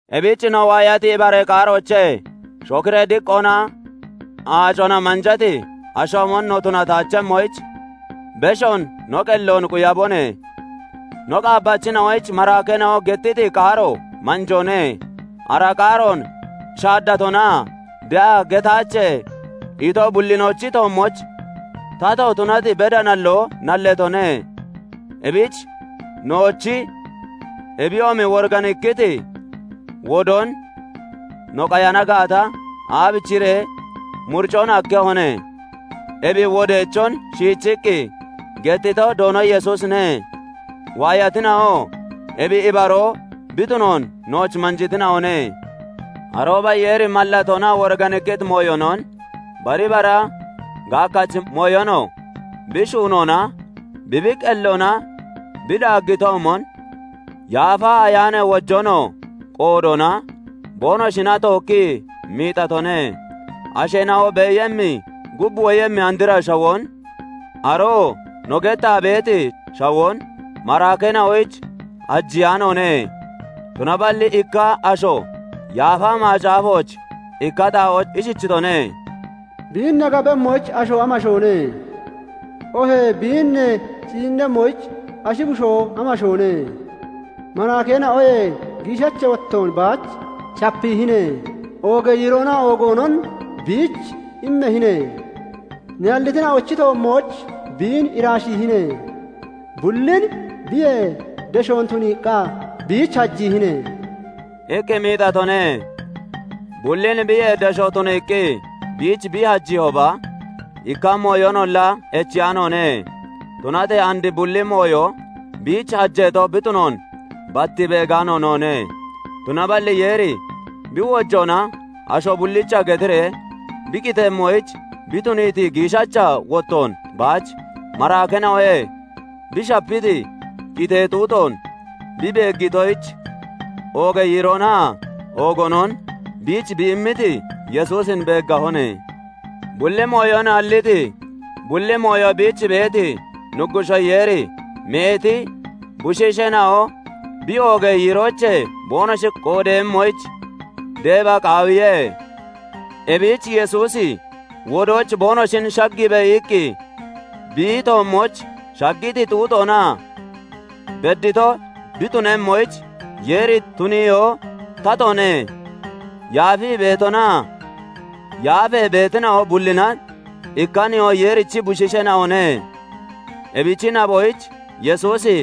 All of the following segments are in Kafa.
Ebich no waayati ibaree qaaroochee shokiree diqqoona aacona manjati ashoomon no tunataachemmoyich, beshoon no qelloon quyabone. No qaabbachina'oyich maraakeena'o gettiti qaaro manjoone; ara qaaroon shaaddatonaa de'a getaache ito bullinochi toommooch tato tunati beda nalloo nalleetone. Ebich nowochi, ebiyoomi woriganikkiti wodoon no qayana gaata, aabichiree muricon hakkehone? Ebi wodeechon shiichiqqi gettito Doono Yesuusine; waayatina'oo ebi ibaroo bi tunoon nooch manjiitina'one. Arooba Yeeri mallatoonaa woriganikkiti mooyonon, bari bara gaakkachi mooyonoo bi shuunoona, bi bi qelloona bi daaggitoomon, Yaafa Ayaanee wojoonoo qoodoona boonoshina tookkii miixatone. Asheena'o beeyemmi, gub woyemmi andra shawoon, aroo no gettaa beeti shawoon maraakeena'oyich hajiyaanoone. Tunaballi ikka asho Yaafa Macaafooch ikka xaa'ooch ishichitone:- "Biin ne gabemmoyich asho amashoone? Oohee biin ne ciinnemmoyich ashi bushoo amashoone? Maraakeena'oyee giishacha wottoon baach shapiihine; oogee yiiroonaa oogoonon biich immahine; [ne hallitina'ochi toommooch biin iraashiihine;] Bullin biyee deshoon tuniiqqa biich hajiihine" iqqi miixatone. Bullin biyee deshoon tuniiqqi biich bi hajiihooba, ikka mooyonolla echiyaanoone; tunatee and bulli mooyo biich hajeeto bi tunoon bat beegaano noone. Tunaballi Yeeri bi wojoona asho bullicha getiree bi qitemmoyich bi tuniiti, giishacha wottoon baach maraakeena'oyee bi shapiiti, qitee xuuxoon bi beeggitoyich, oogee yiiroonaa oogoonon biich bi immiti Yesuusin beeggahone. Bulli mooyon halliti, bulli mooyo biich beeti Nuggushoo Yeeri meeti bushiisheena'o bi oogee yiiroochee boonoshi qoodeeyemmoyich deeba qaawiye; ebich "Yesuusi wodooch boonoshin shaggiibe" iqqi bi toommooch shaggiti xuuxoona beddito bi tunemmoyich Yeeri tuniyoo tatoone. Yaafii beetonaa yaafee beetina'o bullina ikka Nihoo Yeerichi bushiisheena'one; ebichi naboyich Yesuusi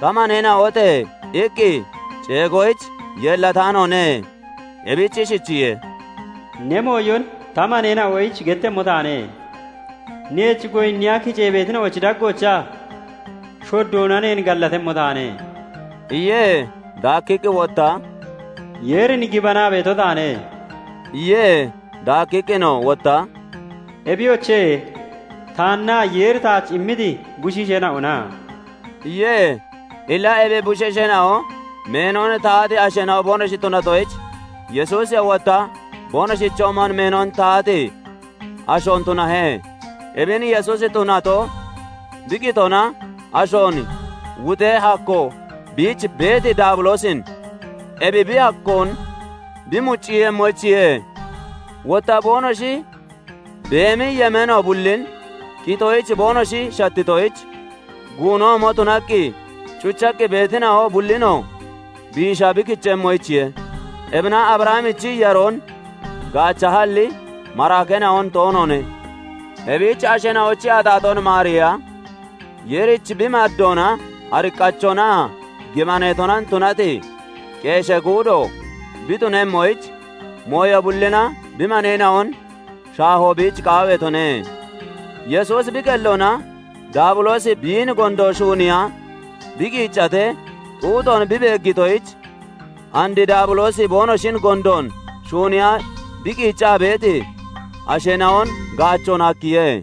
"Ta maneena'ote!" iqqi ceegoyich yeellataanoone. Ebich ishichiye:- "Ne mooyon ta maneena'oyich gettemmo taane; Neech goyinniya kicee beetina'ochi daggoochaa shoddoona neen gallatemmo taane" iye. Daakkiqqi wotta, "Yeerin gibanaa beeto taane" iye. Daakkiqqinoo wotta, "Ebiyoche, taannaa Yeeri taach immiti bushiisheena'ona!" iye. Illa ebi bushiisheena'o meenon tahati asheena'o boonoshi tunatoyich, Yesuusiyoo wotta boonoshichoomon meenon tahati ashoon tunahe. Ebin Yesuusi tunato, bi qitoona ashoon wuxee hakkoo biich beeti Daabiloosin ebi bi hakkoon bi mucciiyemmoyichiye; wotta boonoshi beemi yemeeno bullin qitoyich boonoshi shattitoyich guunoomo tunaqqi cuchaqqi beetina'o bullinoo biisha bi kichemmoyichiye. Ebina Abrahamichi yaroon gaachahalli, maraakeena'on toonoone. Ebich asheena'ochi axaaxoon maariiya, Yeerich bi maddoona ariqqachonaa gibaneetona tunati qeeshee guudo bi tunemmoyich, mooyo bullina bi maneena'on shaahoo biich qaawiitone. Yesuusi bi qelloona Daabiloosi biin gondoon shuuniiya bi qiiccatee xuuxoon bi beeggitoyich, and Daabiloosi boonoshin gondoon shuuniiya bi qiiccaa beeti asheena'on gaachoon hakkiye.